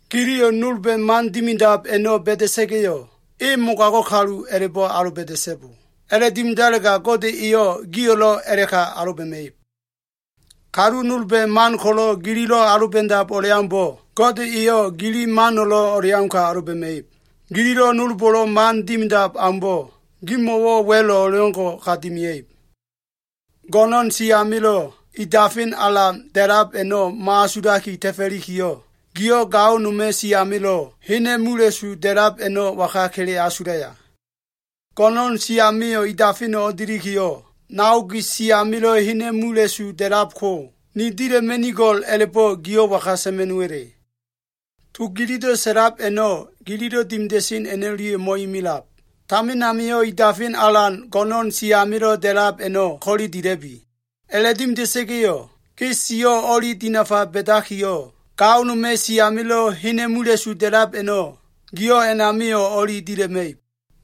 “Giliyo꞉ nolba꞉ man dimidab a꞉no꞉ ba꞉da꞉sa꞉ga꞉yo꞉, e mogago꞉ kalu a꞉la꞉bo꞉ aloba꞉da꞉so꞉bo. A꞉la꞉dimidalega Gode eyo꞉ gio꞉lo꞉ a꞉la꞉ka aloba꞉ma꞉ib. Kalu nolba꞉ man ko꞉lo꞉ gililo꞉ aloba꞉dab o꞉leaumbo꞉, Gode eyo꞉ gili mano꞉lo꞉ o꞉leauka aloba꞉ma꞉ib. Gililo꞉ nolbo꞉lo꞉ man dimidab aumbo꞉, gimo꞉wo꞉lo꞉ wa꞉lo꞉ o꞉leo꞉ngo꞉ ka dimia꞉ib Go꞉no꞉n si amilo꞉ i dafen alan da꞉lab a꞉no꞉ mo꞉asulaki ta꞉fo꞉likiyo꞉, giyo꞉ gao noma꞉ si amilo꞉ hena꞉ mula꞉su da꞉lab a꞉no꞉ waga kele asulaya? Go꞉no꞉n si amio꞉ i dafeno꞉ o꞉delikiyo꞉, nao gi si amilo꞉ hena꞉ mula꞉su da꞉lab ko, ni dila꞉ma꞉nigo꞉l a꞉la꞉bo꞉ giyo꞉ waga sa꞉ma꞉no꞉wa꞉le? To gililo꞉ sa꞉lab a꞉no꞉, gililo꞉ dimida꞉sen a꞉no꞉lia꞉yo꞉ mo꞉imilab. Tamin amio꞉ i dafen alan go꞉no꞉n si amilo꞉ da꞉lab a꞉no꞉ ko꞉le dila꞉bi. A꞉la꞉dimida꞉sa꞉ga꞉yo꞉, ge siyo꞉ o꞉li dinafa ba꞉dakiyo꞉, gao noma꞉ si amilo꞉ hena꞉ mula꞉su da꞉lab a꞉no꞉ giyo꞉ a꞉namio꞉ o꞉li dila꞉ma꞉ib.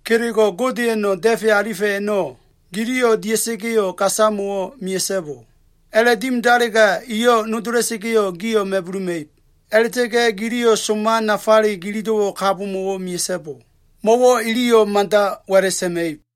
“Kelego꞉ Godeya꞉no꞉ da꞉fe alifa꞉ a꞉no꞉ giliyo꞉ dia꞉sa꞉ga꞉yo꞉ gasamo꞉wo꞉ mea꞉so꞉bo. A꞉la꞉dimialega iyo꞉ nodola꞉sa꞉ga꞉yo꞉ gio꞉ ma꞉buluma꞉ib. A꞉la꞉ta꞉ga꞉ giliyo꞉ soma nafale ginido꞉wo꞉ kabomo꞉wo꞉ dimia꞉so꞉bo. Mo꞉wo꞉ iliyo꞉ madali wa꞉la꞉ sa꞉ma꞉ib.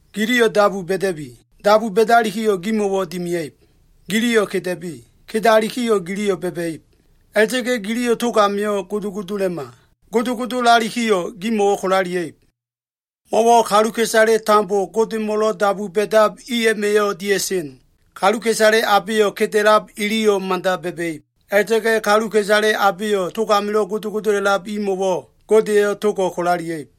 “Giliyo꞉ dabu ba꞉da꞉bi. Dabu ba꞉dalikiyo꞉ gimo꞉wo꞉ dimia꞉ib. Giliyo꞉ keda꞉bi. Kedalikiyo꞉ giliyo꞉ ba꞉ba꞉ib. A꞉la꞉ta꞉ga꞉ giliyo꞉ tog amio꞉ godogodola꞉ma. Godogodolalikiyo꞉ gimo꞉wo꞉ kolalia꞉ib. Mo꞉wo꞉ kaluka꞉isale tambo Godemo꞉lo꞉ dabu ba꞉dab i a꞉ma꞉yo꞉ dia꞉sen. Kaluka꞉isale abeyo꞉ keda꞉lab, iliyo꞉ mada ba꞉ba꞉ib. A꞉la꞉ta꞉ga꞉ kaluka꞉isale abeyo꞉ tog amilo꞉ godogodolab imo꞉wo꞉ Gode eyo꞉ togo꞉ kolalia꞉ib.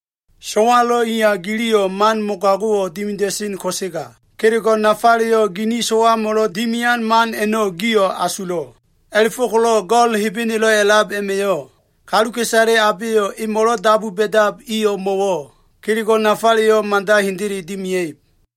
So꞉walo꞉ iya giliyo꞉ man mogago꞉wo꞉ dimida꞉sen ko꞉sega, kelego꞉ nafaleyo꞉ gini so꞉wamo꞉lo꞉ dimian man a꞉no꞉ gio꞉ asulo꞉. A꞉la꞉fo꞉ko꞉lo꞉ Go꞉l Hebenelo꞉ a꞉lab a꞉ma꞉yo꞉ kaluka꞉isale abeyo꞉ emo꞉lo꞉ dabu ba꞉dab i o꞉mo꞉wo꞉ kelego꞉ nafaleyo꞉ mada hendele dimia꞉ib.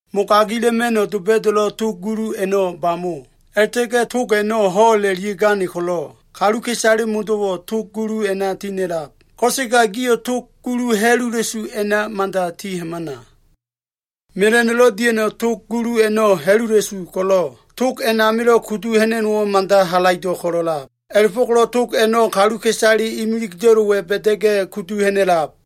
“Mogagila꞉ma꞉no꞉ doba꞉da꞉lo꞉ tog gulu a꞉no꞉ bamo, a꞉la꞉ta꞉ga꞉ tog a꞉no꞉ ho꞉la꞉lia꞉gane ko꞉lo꞉, kaluka꞉isale modo꞉wo꞉ tog gulu a꞉na ti ha꞉na꞉lab. Ko꞉sega gio꞉ tog gulu ha꞉lula꞉su a꞉na mada ti hamana. Mela꞉no꞉lo꞉ dia꞉no꞉ tog gulu a꞉no꞉ ha꞉lula꞉su ko꞉lo꞉, tog a꞉namilo꞉ kudu ha꞉na꞉no꞉wo꞉ mada halaido꞉ ko꞉lo꞉lab. A꞉la꞉fo꞉ko꞉lo꞉ tog a꞉no꞉ kaluka꞉isale imilida꞉lo꞉wa꞉ ba꞉da꞉ga꞉ kudu ha꞉na꞉lab.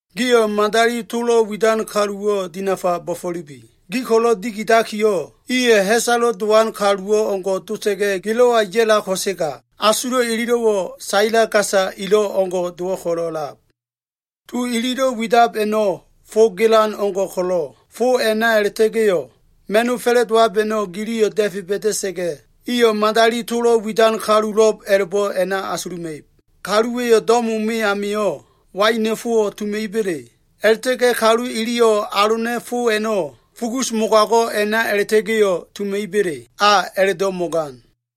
“Gio꞉ madali tolo꞉ widan kaluwo꞉ dinafa bo꞉fo꞉lubi. Gi ko꞉lo꞉ dikidakiyo꞉, iyo꞉ ha꞉salo꞉ dowan kalu o꞉ngo꞉ dota꞉ga꞉ gilo꞉wa ya꞉lab ko꞉sega, asulo꞉ ililo꞉wo꞉ saila gasa elo꞉ o꞉ngo꞉ dowo꞉ ko꞉lo꞉lab. To ililo꞉ widab a꞉no꞉ fo gelan o꞉ngo꞉ ko꞉lo꞉, fo a꞉na a꞉la꞉ta꞉ga꞉yo꞉ ma꞉no꞉ fa꞉la꞉dowab a꞉no꞉ giliyo꞉ da꞉fe ba꞉da꞉sa꞉ga꞉, iyo꞉ madali tolo꞉ widan kalulo꞉b a꞉la꞉bo꞉ a꞉na asuluma꞉ib. Kaluwa꞉yo꞉ do꞉mo me amio꞉ waina꞉ fowo꞉ tuma꞉iba꞉le? A꞉la꞉ta꞉ga꞉ kalu iliyo꞉ alona꞉ fo a꞉no꞉ fugus mogago꞉ a꞉na a꞉la꞉ta꞉ga꞉yo꞉ tuma꞉iba꞉le? A a꞉la꞉do꞉ mo꞉gan.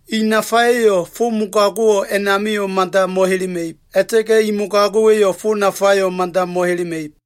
I nafa a꞉ma꞉yo꞉ fo mogago꞉wo꞉ a꞉namio꞉ mada mo꞉helema꞉ib. A꞉la꞉ta꞉ga꞉ i mogago꞉wa꞉yo꞉ fo nafayo꞉ mada mo꞉helema꞉ib.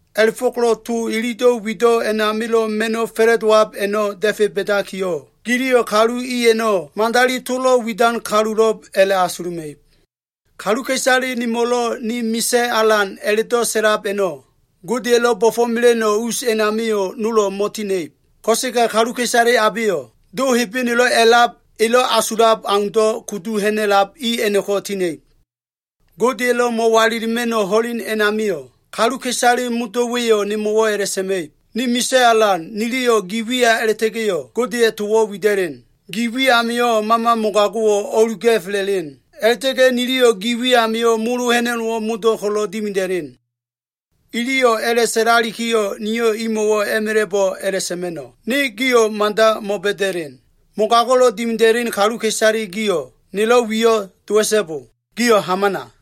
A꞉la꞉fo꞉ko꞉lo꞉ to ilido꞉ wido꞉ amilo꞉ ma꞉no꞉ fa꞉la꞉dowab a꞉no꞉ da꞉fe ba꞉dakiyo꞉, giliyo꞉ kalu i a꞉no꞉ madali tolo꞉ widan kalulo꞉b a꞉la꞉asuluma꞉ib. “Kaluka꞉isale nemo꞉lo꞉, ‘Ni Misa꞉ Alan’ a꞉la꞉do꞉ sa꞉lab a꞉no꞉ Godeya꞉lo꞉ bo꞉fo꞉mela꞉no꞉ us a꞉namio꞉ nolo꞉ mo꞉tina꞉ib. Ko꞉sega kaluka꞉isale abeyo꞉ Do Hebenelo꞉ a꞉lab elo꞉ asulab aundo꞉ kudu ha꞉na꞉lab i a꞉no꞉ko꞉ ti ha꞉na꞉ib. Godeya꞉lo꞉ mo꞉walilima꞉no꞉ ho꞉len a꞉namio꞉, kaluka꞉isale modo꞉wa꞉yo꞉ nemo꞉wo꞉ a꞉la꞉sa꞉ma꞉ib, ‘Ni Misa꞉ Alan, niliyo꞉ gi wiya a꞉la꞉ta꞉ga꞉yo꞉ Godeya꞉ towo꞉ wida꞉len. Gi wi amio꞉ mama mogago꞉wo꞉ o꞉luga꞉fela꞉len. A꞉la꞉ta꞉ga꞉ niliyo꞉ gi wi amio꞉ molo ha꞉na꞉no꞉wo꞉ modo꞉ ko꞉lo꞉ dimida꞉len.’ Iliyo꞉ a꞉la꞉sa꞉lalikiyo꞉, niyo꞉ imo꞉wo꞉ a꞉ma꞉la꞉bo꞉ a꞉la꞉sa꞉ma꞉no꞉, ‘Ne gio꞉ mada mo꞉ba꞉da꞉len. Mogago꞉lo꞉ dimida꞉len kaluka꞉isale gio꞉ nelo꞉ wiyo꞉ dowa꞉so꞉bo. Gio꞉ hamana.’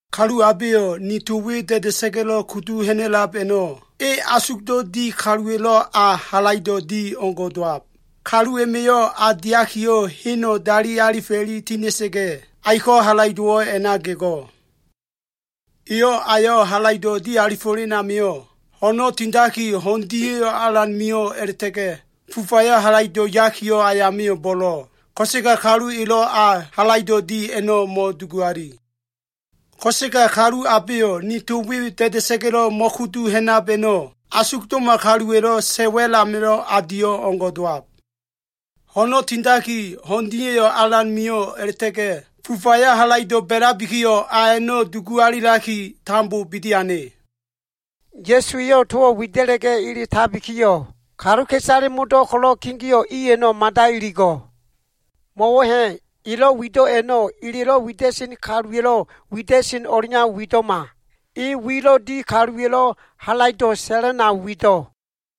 “Kalu abeyo꞉ ni to we da꞉da꞉sa꞉ga꞉lo꞉ kudu ha꞉na꞉lab a꞉no꞉ e asugdo꞉ di kaluwa꞉lo꞉ a halaido꞉ di o꞉ngo꞉ dowab. Kalu a꞉ma꞉yo꞉ a diakiyo꞉, heno꞉ dali alifela꞉i tina꞉sa꞉ga꞉, aiko꞉ halaido꞉wo꞉ a꞉na gego꞉. Eyo꞉ ayo꞉ halaido꞉ di alifo꞉len amio꞉, ho꞉no꞉ tindaki ho꞉n dia꞉yo꞉ alan mio꞉ a꞉la꞉ta꞉ga꞉ fufayo꞉ halaido꞉ yakiyo꞉ ayamio꞉ bo꞉lo꞉. Ko꞉sega kalu elo꞉ a halaido꞉ di a꞉no꞉ mo꞉dugu ali. Ko꞉sega kalu abeyo꞉ ni to we da꞉da꞉sa꞉ga꞉lo꞉ mo꞉kudu ha꞉nab a꞉no꞉ asugdo꞉ma kaluwa꞉lo꞉ sa꞉ wa꞉l amilo꞉ a di o꞉ngo꞉ dowab. Ho꞉no꞉ tindaki, ho꞉n dia꞉yo꞉ alan mio꞉ a꞉la꞉ta꞉ga꞉ fufayo꞉ halaido꞉ ba꞉labikiyo꞉, a a꞉no꞉ dugu alilaki, tambo bidi ane.” Ya꞉su eyo꞉ towo꞉ wida꞉la꞉ga꞉ eletabikiyo꞉, kaluka꞉isale modo꞉ ko꞉lo꞉ kegeo꞉ i a꞉no꞉ mada iligo꞉. Mo꞉wo꞉ ha꞉, elo꞉ wido꞉ a꞉no꞉, elelo꞉ wida꞉sen kaluwa꞉lo꞉ wida꞉sen o꞉leau wido꞉ma. E wilo꞉ di kaluwa꞉lo꞉ halaido꞉ sa꞉lan au wido꞉.